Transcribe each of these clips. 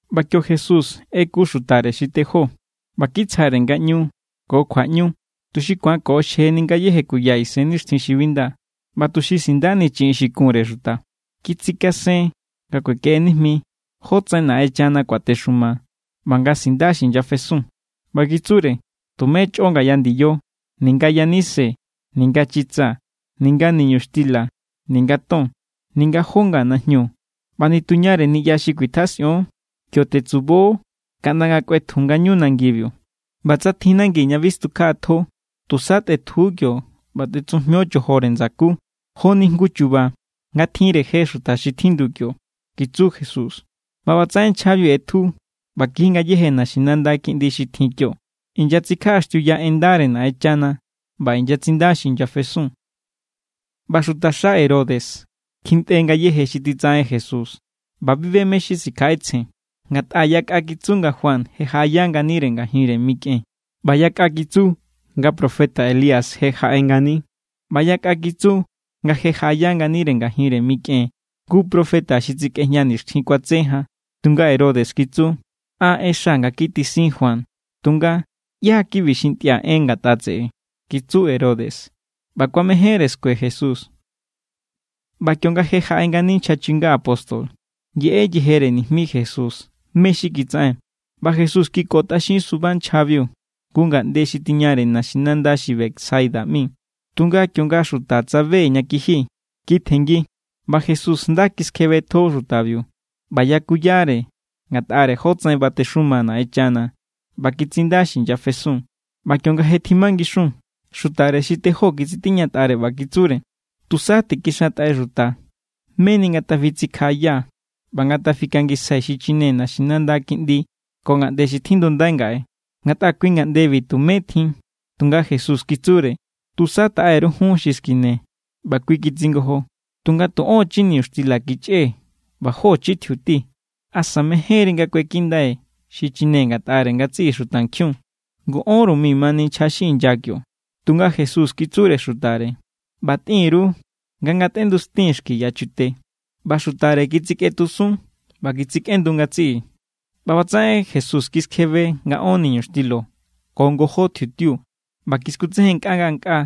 ꞌBa kio Jesús ꞌeku xutare xi tejó ꞌba kitsjare ngaꞌñu ko kjuaꞌñu tuxi ku̱an koꞌoxjeni ngayéje kuya isennixtjin xi bi nda ꞌba tuxi sindani chiꞌin xi kunre xuta. Kitsikasen nga kuekeꞌe nijmi jótsaꞌen Naꞌenchana kuatexuma ꞌba nga sinda xi inyafesun. ꞌBa kitsure: —Tumé chꞌo ngaya ndiyo: ninga yanise, ninga chitsa, ninga niñuxtila, ninga ton, ninga jó nga najñu. ꞌBa nituñare niꞌya xi kuitjasꞌion, kio tetsubo kaꞌnda nga kꞌuetju ngañu nangibiu. ꞌBa tsa tjin nangi ña bi stukjaꞌatjo, tusa tꞌetju kio ꞌba tꞌetsujmio chojore ndsakú, joni jngu chu̱ba̱ nga tjinre je xuta xi tjindu kio —kitsu Jesús. ꞌBa ꞌbatsaꞌen nchjabiu ꞌetju ꞌba kiji ngayéje naxinanda kiꞌndi xi tjin kio. Inyatsikjaꞌaxtiuya en ndare Naꞌenchana ꞌba inyatsinda xi inyafesun. ꞌBa xutaxa Herodes kjintꞌe ngayéje xi titsaꞌen Jesús, ꞌba bi be mé= xi sikjaꞌetsjen. Ngatꞌa yakꞌa kitsu nga Juan je jaꞌaya nganire ngajinre mikꞌen, ꞌba yakꞌa kitsu nga profeta Elías je jaꞌe ngani, ꞌba yakꞌa kitsu nga je jaꞌaya nganire ngajinre mikꞌen jngu profeta xi tsikꞌejña nixtjin kuatse jan. Tunga Herodes kitsu: —An ꞌexa nga kitisin Juan. Tunga, ¿ꞌyá= kibi xi ntꞌia̱ en ngatꞌa tseꞌe? —kitsu Herodes ꞌba kuamejénre skue Jesús. ꞌBa kionga je jaꞌe ngani nchja chinga apóstol, yeꞌe yejere nijmi Jesús mé= xi kitsaꞌen. ꞌBa Jesús kikotꞌaxin suba nchjabiu jngu ngaꞌnde xi tiñare naxinanda xi Betsaida ꞌmi. Tunga kionga xuta tsabe ña kiji, kitjenngi. ꞌBa Jesús nda kiskjebetjo xutabiu ꞌba yakuyare ngatꞌare jótsaꞌen batexuma Naꞌenchana ꞌba kitsinda xi inyafesun. ꞌBa kionga je tjimangixun, xutare xi tejó kitsitiñatꞌare ꞌba kitsure: —Tusa tikixantꞌai xuta, meni ngatafitsikjaꞌaya ꞌba ngatafikangisjai xichine naxinanda kiꞌndi ko ngaꞌnde xi tjindundai ngaꞌe, ngatꞌa kui ngaꞌndebi tumé tjin. Tunga Jesús kitsure: —Tusa taꞌe_ru jun xi skine. ꞌBa kui kitsingojo: —Tunga tu ón chi niñuxtila kichꞌee̱ ꞌba jó chi tjiuti. ¿Asa mejénri nga kuekindai xichine ngatꞌare ngatsiꞌi xutankjiun? Ngu ónru mi mani nchja xi inya kio. Tunga Jesús kitsure xutare: —ꞌBa tꞌin_ru nga ngatꞌendustin xki yachute. ꞌBa xutare kitsikꞌetjusun ꞌba kitsikꞌendu ngatsiꞌi. ꞌBa ꞌbatsaꞌen Jesús kiskjebe nga ón niñuxtila ko ngojó tjiutiu. ꞌBa kiskutsejen ngankꞌaa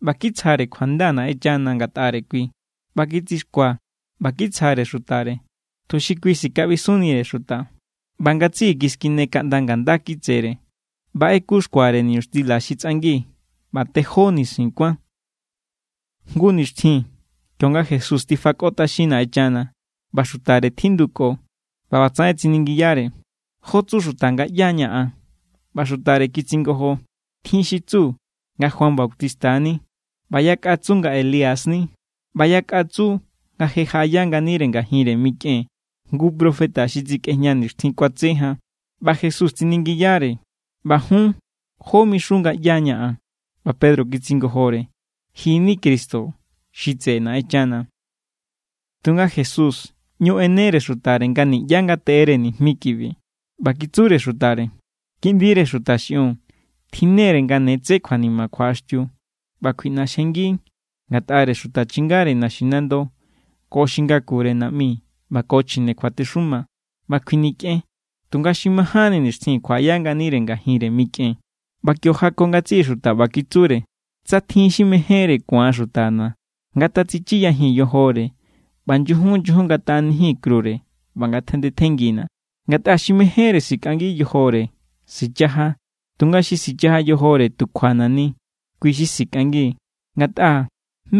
ꞌba kitsjare kjuanda Naꞌenchana ngatꞌare kui, ꞌba kitsixkua ꞌba kitsjare xutare, tuxi kui sikaꞌbisunnire xuta. ꞌBa ngatsiꞌi kiskine kaꞌnda nga̱ nda kitsere. ꞌBa ꞌeku xkuare niñuxtila xi tsꞌangi, ꞌba tejó nisin kuán. Jngu nixtjin kionga Jesús tifakotꞌaxin Naꞌenchana, ꞌba xutare tjinduko, ꞌba ꞌbatsaꞌen tsiningiyare: —¿Jó tsu xuta nga ꞌyá= ña̱ an? ꞌBa xutare kitsingojo: —Tjin xi tsu nga Juan Bautista= ni. ꞌBa yakꞌa tsu nga Elías= ni, ꞌba yakꞌa tsu nga je jaꞌaya nganire ngajinre mikꞌen jngu profeta xi tsikꞌejña nixtjin kuatse jan. ꞌBa Jesús tsiningiyare: —ꞌBa jun, ¿jó mixun nga ꞌyá= ña̱ an? ꞌBa Pedro kitsingojore: —Ji= ni Cristo xi tseꞌe Naꞌenchana. Tunga Jesús ꞌñu ꞌenere xutare nga niꞌyá ngateꞌere nijmi kibi. ꞌBa kitsure xutare: —Kiꞌndire Xuta xiꞌiun tjinnere nga ne tse kjuanima kjuaꞌaxtiu. ꞌBa kjuiꞌnaxjengi ngatꞌare xuta chingare naxinando, ko xi ngakure naꞌmi ꞌba ko chjine kjuatexuma, ꞌba kjuinikꞌen, tunga xi majánni nixtjin kjuaꞌaya nganire ngajinre mikꞌen. ꞌBa kio jako ngatsiꞌi xuta, ꞌba kitsure: —Tsa tjin xi mejénre ku̱an xutana̱, ngatatsichiyajin yojore ꞌba nyujun nyujun ngatjaꞌanijin krure ꞌba ngatjandetjenngina̱. Ngatꞌa xi mejénre sikꞌangi yojore, sichaja; tunga xi sichaja yojore tu kjuana̱ ni, kui= xi sikꞌangi. Ngatꞌa,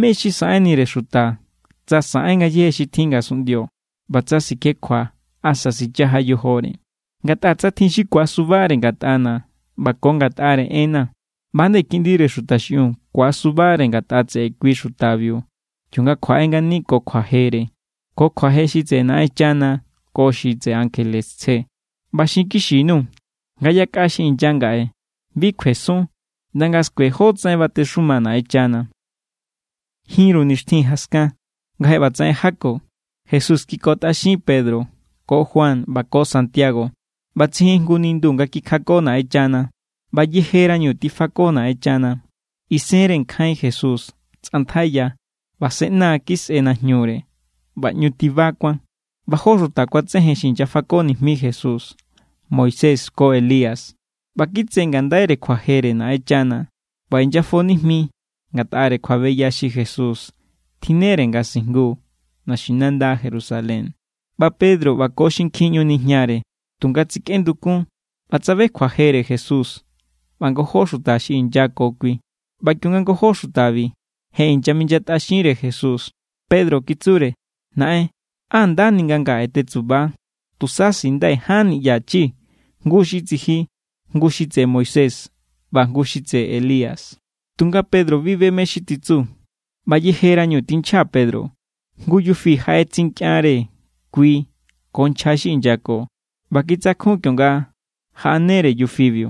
¿mé= xi saꞌenire xuta tsa saꞌen ngayéje xi tjin ngasunꞌndio, ꞌba tsa sikjekjua asa sichaja yojore? Ngatꞌa tsa tjin xi ku̱asubare ngatꞌana̱ ꞌba ko ngatꞌare enna̱, ꞌba=nde Kiꞌndire Xuta xiꞌiun ku̱asubare ngatꞌa tseꞌe kui xutabiu kionga kjuaꞌe ngani ko kjuajere, ko kjuaje xi tseꞌe Naꞌenchana ko xi tseꞌe ankjele tsje. ꞌBa xinkixi_nuu̱ nga yakꞌa xi inya ngaꞌe bi kjuesun ꞌnda nga̱ skue jótsaꞌen batexuma Naꞌenchana. Jinru nixtjin jaskan nga je ꞌbatsaꞌen jako, Jesús kikotꞌaxin Pedro ko Juan ꞌba ko Santiago ꞌba tsijin jngu nindu nga kikjako Naꞌenchana. ꞌBa yejerañu tifako Naꞌenchana, isenre nkjain Jesús tsꞌantjaiya ꞌba se ꞌna kisꞌe najñure ꞌba ꞌñu tiba kuán. ꞌBa jó xuta kuatsejen xi inyafako nijmi Jesús, Moisés ko Elías. ꞌBa kitse ngandaire kjuajere Naꞌenchana ꞌba inyafo nijmi ngatꞌare kjuabeya xi Jesús tjinnere nga sijngu naxinanda Jerusalén. ꞌBa Pedro ꞌba ko xinkjin ꞌñu nijnare, tunga tsikꞌendukun ꞌba tsabe kjuajere Jesús ꞌba ngojó xuta xi inya ko kui. ꞌBa kionga ngojó xutabi je inyaminyatꞌaxinre Jesús, Pedro kitsure: —Naꞌen, ¡á ndani nga ngaꞌe tetsuba! Tusa sindai̱ ján niꞌya chi, jngu xi tsiji, jngu xi tseꞌe Moisés ꞌba jngu xi tseꞌe Elías. Tunga Pedro bi be mé= xi titsu. ꞌBa yejerañu tinchja Pedro, jngu yufi jaꞌetsinkꞌianre kui ko nchja xi inyako, ꞌba kitsakjun kionga jaꞌanere yufibiu.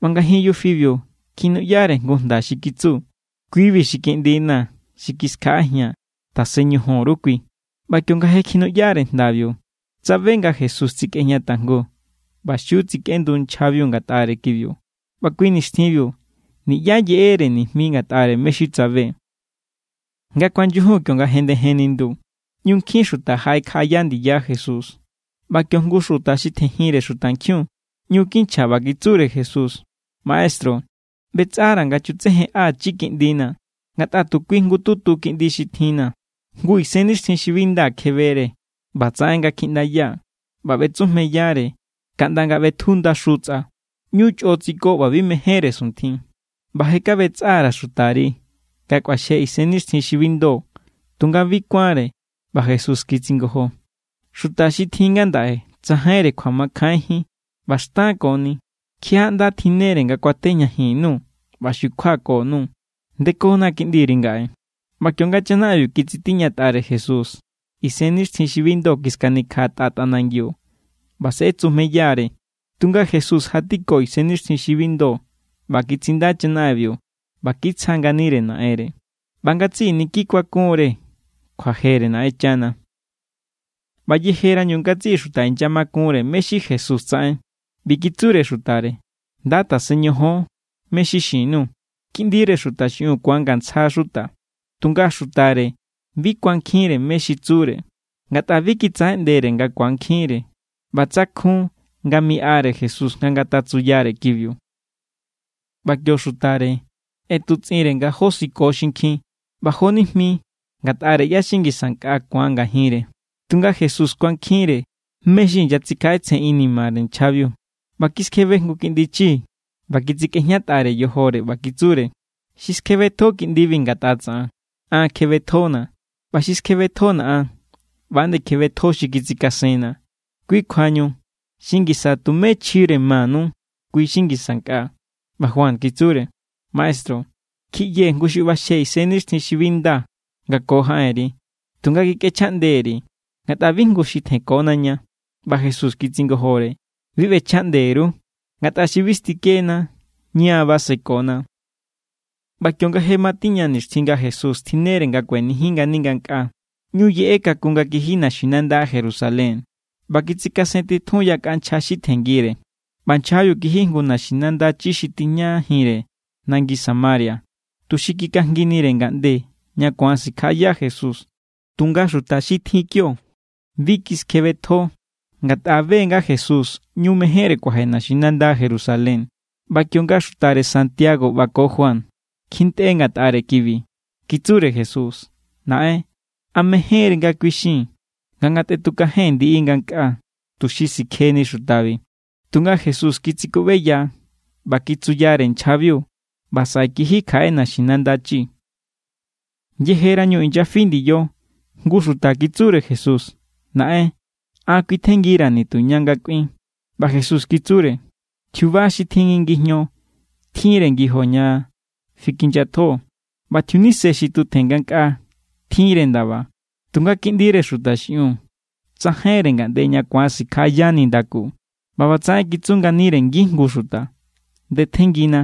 ꞌBa ngajin yufibiu kjinuꞌyare jngu jnda xi kitsu: —Kui=bi xi kiꞌndina̱ xi kiskjaꞌajia̱n. Tasen ñojon_ru kui. ꞌBa kionga je kjinuꞌyare jndabiu, tsabe nga Jesús tsikꞌejña tajngu. ꞌBa xiu tsikꞌendu nchjabiu ngatꞌare kibiu, ꞌba kui nixtjinbiu niꞌyá yeꞌere nijmi ngatꞌare mé= xi tsabe. Nga kuanyujun, kionga jendejen nindu, ꞌñu nkjin xuta jaꞌekjaꞌaya ndiya Jesús. ꞌBa kio jngu xuta xi tjenjinre xutankjiun ꞌñu kinchja ꞌba kitsure Jesús: —Maestru, ꞌbetsꞌara̱ nga chutsejenꞌachi kiꞌndina̱. Ngatꞌa tu kui jngututu kiꞌndi xi tjinna̱. Jngu isennixtjin xi bi nda kjebere ꞌba tsaꞌen nga kjiꞌndaya ꞌba ꞌbetsujmeyare kaꞌnda nga ꞌbetju ndaxu tsꞌa. ꞌÑu chꞌo tsiko ꞌba bi mejénre suntjin. ꞌBa je kaꞌbetsꞌa_ra̱ xutari nga kꞌuaxje isennixtjin xi bi ndo, tunga bi kuánre. ꞌBa Jesús kitsingojo: —¡Xuta xi tjin ngandaꞌe tsajainre kjuamakjainjín ꞌba xtankoni! ¿Kjiaꞌá= ꞌnda tjinnere nga kuatejñajin_nuu̱ ꞌba xukjuako_nuu̱? Ndekona kiꞌndiri ngaꞌe. ꞌBa kionga chanaꞌenbiu titsitiñatꞌare Jesús, isennixtjin xi bi ndo kiskanikjaꞌatꞌa tꞌanangiu ꞌba se ꞌetsujmeya=re. Tunga Jesús jatiko isennixtjin xi bi ndo ꞌba kitsinda chanaꞌenbiu ꞌba kitsja nganire naꞌenre. ꞌBa ngatsiꞌi niki kuakunre kjuajere Naꞌenchana. ꞌBa yejerañu ngatsiꞌi xuta inyamakunre mé= xi Jesús tsaꞌen, ꞌbi kitsure xutare: —Nda tasen ñojon mé= xi xin_nuu̱. Kiꞌndire Xuta xiꞌiun ku̱angantsja xuta. Tunga xutare bi kuankjinre mé= xi tsure, ngatꞌa bi kitsaꞌeꞌndere nga ku̱ankjinre. ꞌBa tsakjun nga miꞌare Jesús nga ngatatsuyare kibiu. ꞌBa kio xutare ꞌetutsꞌinre nga josiko xinkjin ꞌba jonijmi ngatꞌare ꞌyá= xi ngisa nkꞌa ku̱an ngajinre. Tunga Jesús kuankjinre mé= xi inyatsikjaꞌetsjen inimare nchjabiu, ꞌba kiskjebe jngu kiꞌndi chi ꞌba kitsikꞌejñatꞌare yojore. ꞌBa kitsure: —Xi skjebetjo kiꞌndibi ngatꞌa tsaꞌan, an kjebetjona̱. ꞌBa xi skjebetjona̱ an, ꞌba=nde kjebetjo xi kitsikasenna̱. Kui kjuañu xi ngisa tumé chjire manu, kui= xi ngisa nkꞌa. ꞌBa Juan kitsure: —Maestru, kjiꞌyee̱ jngu xi ꞌbaxje isennixtjin xi bi nda nga ko jaꞌenri. Tunga kikꞌechjaꞌnde_ri̱, ngatꞌa bi jngu xi tjenkona ña. ꞌBa Jesús kitsingojore: —Bi ꞌbechjaꞌnde_ru, ngatꞌa xi bi stikena, ña= basekona. ꞌBa kionga je matiña nixtjin nga Jesús tjinnere nga kuenijin ngani ngankꞌaa, ꞌñu yeꞌe kakun nga kiji naxinanda Jerusalén. ꞌBa kitsikasentitjun yakꞌa nchja xi tjenngire. ꞌBa nchjabiu kiji jngu naxinanda chi xi tijñajinre nangi Samaria, tuxi kikajnginire ngaꞌnde ña ku̱an sikjaꞌaya Jesús. Tunga xuta xi tjin kio, bi kiskjebetjo, ngatꞌa be= nga Jesús ꞌñu mejénre kuaje naxinanda Jerusalén. ꞌBa kionga xutare Santiago ꞌba ko Juan kjintꞌe ngatꞌare kibi, kitsure Jesús: —Naꞌen, ¿a mejénri nga kuixii̱n nga ngatꞌetukajen ndiꞌi ngankꞌaa, tuxi sikjeni xutabi? Tunga Jesús kitsikuꞌbeya ꞌba kitsuyare nchjabiu. ꞌBa saꞌe kiji kjaꞌe naxinanda chi. Yejerañu inyafi ndiyo, jngu xuta kitsure Jesús: —Naꞌen, an kjuitjenngira̱ nituña nga kꞌuin. ꞌBa Jesús kitsure: —Tjiuba xi tjin ngi ngijño tjinre ngijo ña fikinyatjo, ꞌba tjiunise xi tutjen ngankꞌaa tjinre ndaba. Tunga Kiꞌndire Xuta xiꞌiun, tsajainre ngaꞌnde ña ku̱an sikjaꞌaya nindaku. ꞌBa ꞌbatsaꞌen kitsu nganire ngijngu xuta: —Ndetjenngina.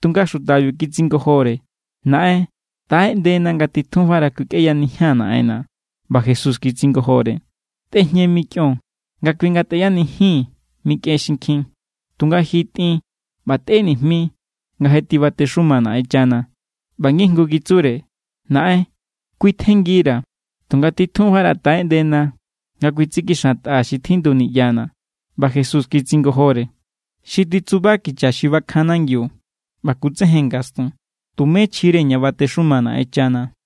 Tunga xutabiu kitsingojore: —Naꞌen, taꞌeꞌndena nga titjunfara kuikꞌeyanijia̱n naꞌenna̱. ꞌBa Jesús kitsingojore: —Tꞌejñe mikꞌion nga kui ngatꞌeyanijin mikꞌen xinkjin. Tunga ji tꞌin, ꞌba tꞌe nijmi nga je tibatexuma Naꞌenchana. ꞌBa ngijngu kitsure: —Naꞌen, kuitjenngira̱, tunga titjunfara taꞌeꞌndena nga kuitsikixantꞌaa̱ xi tjindu niꞌyana̱. ꞌBa Jesús kitsingojore: —Xi titsuba kicha xi bakjan nangiu ꞌba kutsejen ngastun, tumé chjire ña batexuma Naꞌenchana.